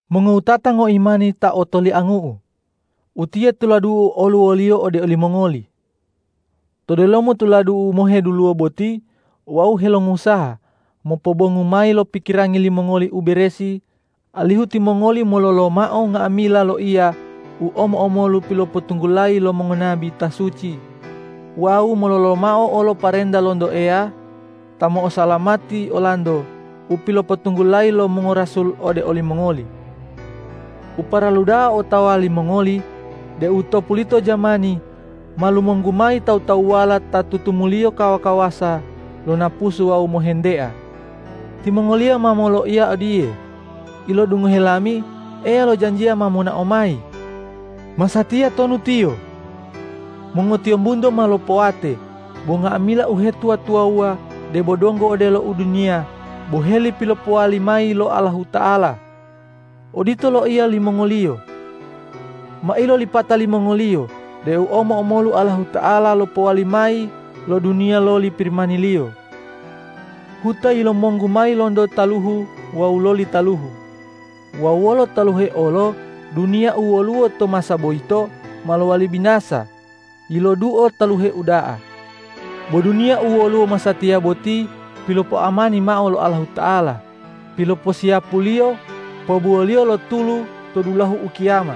Mongowutata ngoimani ta otoliangu'u! Utiye tuladu'u oluwoliyo ode olimongoli. To delomo tuladu'u moheduluwo boti wau helongusaha mopobongu mayi lo pikirangi limongoli u beresi, alihu timongoli mololomao nga'amila loiya u omo-omolu pilopotunggulayi lo mongonabi ta suci wawu mololomao olo parenta lonto Eya ta mo'osalamati olanto u pilopotunggulayi lo mongorasul ode olimongoli. U paralu da'a otawa limongoli deu to pulito jamani ma lumonggu mayi tawu-tawuwala ta tutumuliyo kawa-kawasa lo napusu wawu mohentea. Timongoliyo ma moloiya odiye,”Ilodungohe lami Eya lojanjiya ma monao mayi! Masatiya tonu Tiyo? Mongotiyombunto ma lopowate bo nga'amila uhetuwa-tuwawuwa debo donggo odelo u duniya boheli pilopowali mayi lo Allahuta'ala!” Odito loiya limongoliyo. Ma ilolipata limongoliyo deu omo-omolu Allahuta'ala lopowali mayi lo duniya loli Pirimani-Liyo. Huta yilumonggu mayi lonto taluhu wawu loli taluhu wawu wolo taluhe olo duniya u woluwo to masa boyito ma lowali binasa yiloduo taluhe uda'a. Bo duniya u woluwo masatiya boti pilopoamani mao lo Allahuta'ala piloposiyapu-Liyo pobuwo-Liyo lo tulu to dulahu ukiyama.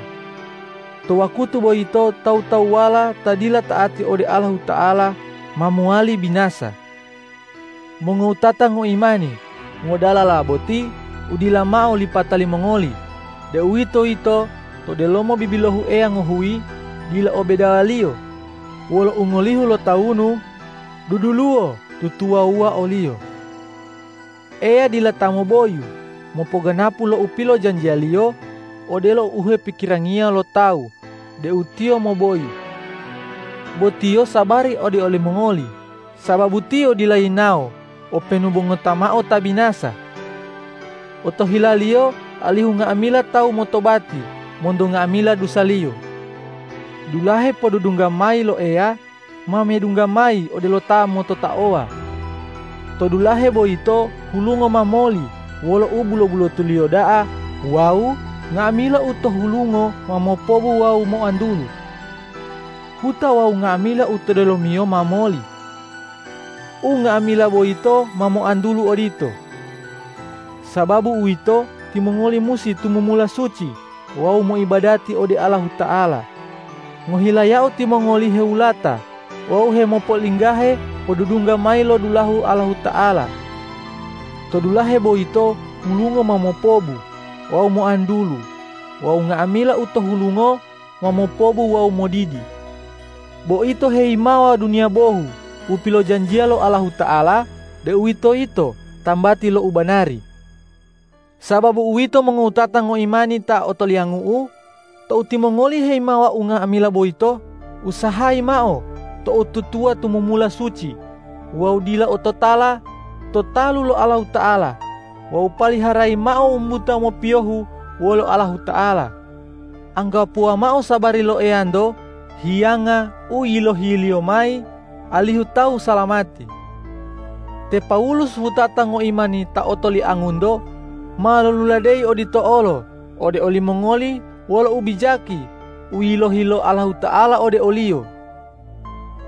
To wakutu boyito tawu-tawuwala ta dila ta'ati ode Allahuta'ala ma mowali binasa. Mongowutata ngoimani, ngodalala boti u dila mao lipata limongoli, deuwitoyito to delomo bibilohu Eya ngohuyi dila o bedawaliyo wolo ungolihu lotawunu, duduluwo tutuwawuwa o-Liyo. Eya dila ta moboyu mopoganapu lo u pilojanjiya-Liyo, odelo u hepikirangiyo lo tawu deu Tiyo moboyu. Bo Tiyo sabari ode olimongoli, sababu Tiyo dila yinawo openu bo ngota mao ta binasa. Otohila-Liyo alihu nga'amila tawu motobati monto nga'amila dusaliyo. Dulahe podudungga mayi lo Eya ma medungga mayi odelo ta mototaowa. To dulahe boyito hulungo ma moli wolo ubulo-bulotuliyo da'a wawu nga'amila u to hulungo ma mopobu wawu moantulu. Huta wawu nga'amila u to delomiyo ma moli. Unga'amila boyito ma moantulu odito. Sababu uwito, timongoli musi tumumula suci wawu moibadati ode Allahuta'ala ngohilayao timongoli hewulata wawu hemopo'olinggahe podudungga mayi lo dulahu Allahuta'ala. To dulahe boyito hulungo ma mopobu wawu moantulu wawu nga'amila u to hulungo ma mopobu wawu modidi. Bo ito heyimawa duniya bohu u pilojanjiya lo Allahuta'ala, deuwitoyito tambati lo u banari. Sababu uwito mongowutata ngoimani ta otoliangu'u, tou timongoli heyimawa unga'amila boyito, usahayi mao to'otutuwa tumumula suci wawu dila ototala to talu lo Allahuta'ala wawu paliharayi mao wumbuta mopiyohu wolo Allahuta'ala. Anggapuwa mao sabari lo Eyanto hiyanga u yilohi-Liyo mayi alihu tawu salamati. Te Pawulus wutata ngoimani ta otoliangunto ma loluladeyi odito olo ode olimongoli wolo ubijaki u yilohi lo Allahuta'ala ode oliyo.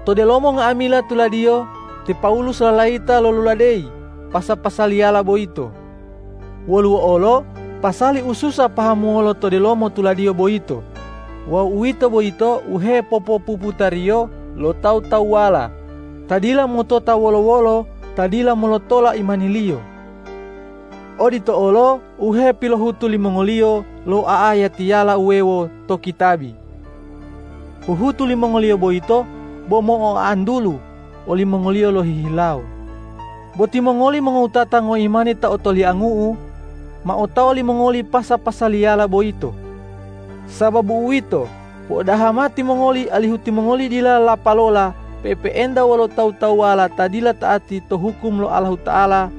To delomo nga'amila tuladiyo te Pawulus lalayita loluladeyi pasa-pasaliyala boyito. Woluwo olo pasali u susa pahamuwolo to delomo tuladiyo boyito wawu uwito boyito u hepopopuputariyo lo tawu-tawuwala ta dila motota wolo-wolo ta dila molotola imaniliyo. Odito olo u hepilohutu limongoliyo lo a'ayatiyala wuwewo to kitabi. Huhutu limongoliyo boyito bo mo'oantulu olimongoliyo lohihilawo. Bo timongoli mongowutata ngoimani ta otoliangu'u, ma otawa limongoli pasa-pasaliyala boyito. Sababu uwito, po'odaha timongoli alihu timongoli dila lapalola pe'epe'enta wolo tawu-tawuwala ta dila ta'ati to hukum lo Allahuta'ala,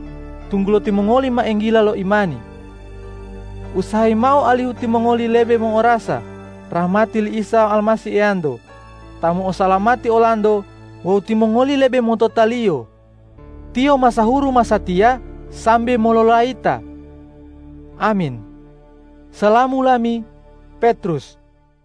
tunggulo timongoli ma enggila lo imani. Usahayi mao alihu timongoli lebe mo'orasa rahmati li Isa Almasih Eyanto ta mo'osalamati olanto wawu timongoli lebe motota-Liyo. Tiyo masahuru masatiya sambe mololayita. Amin. Salamu lami, Petrus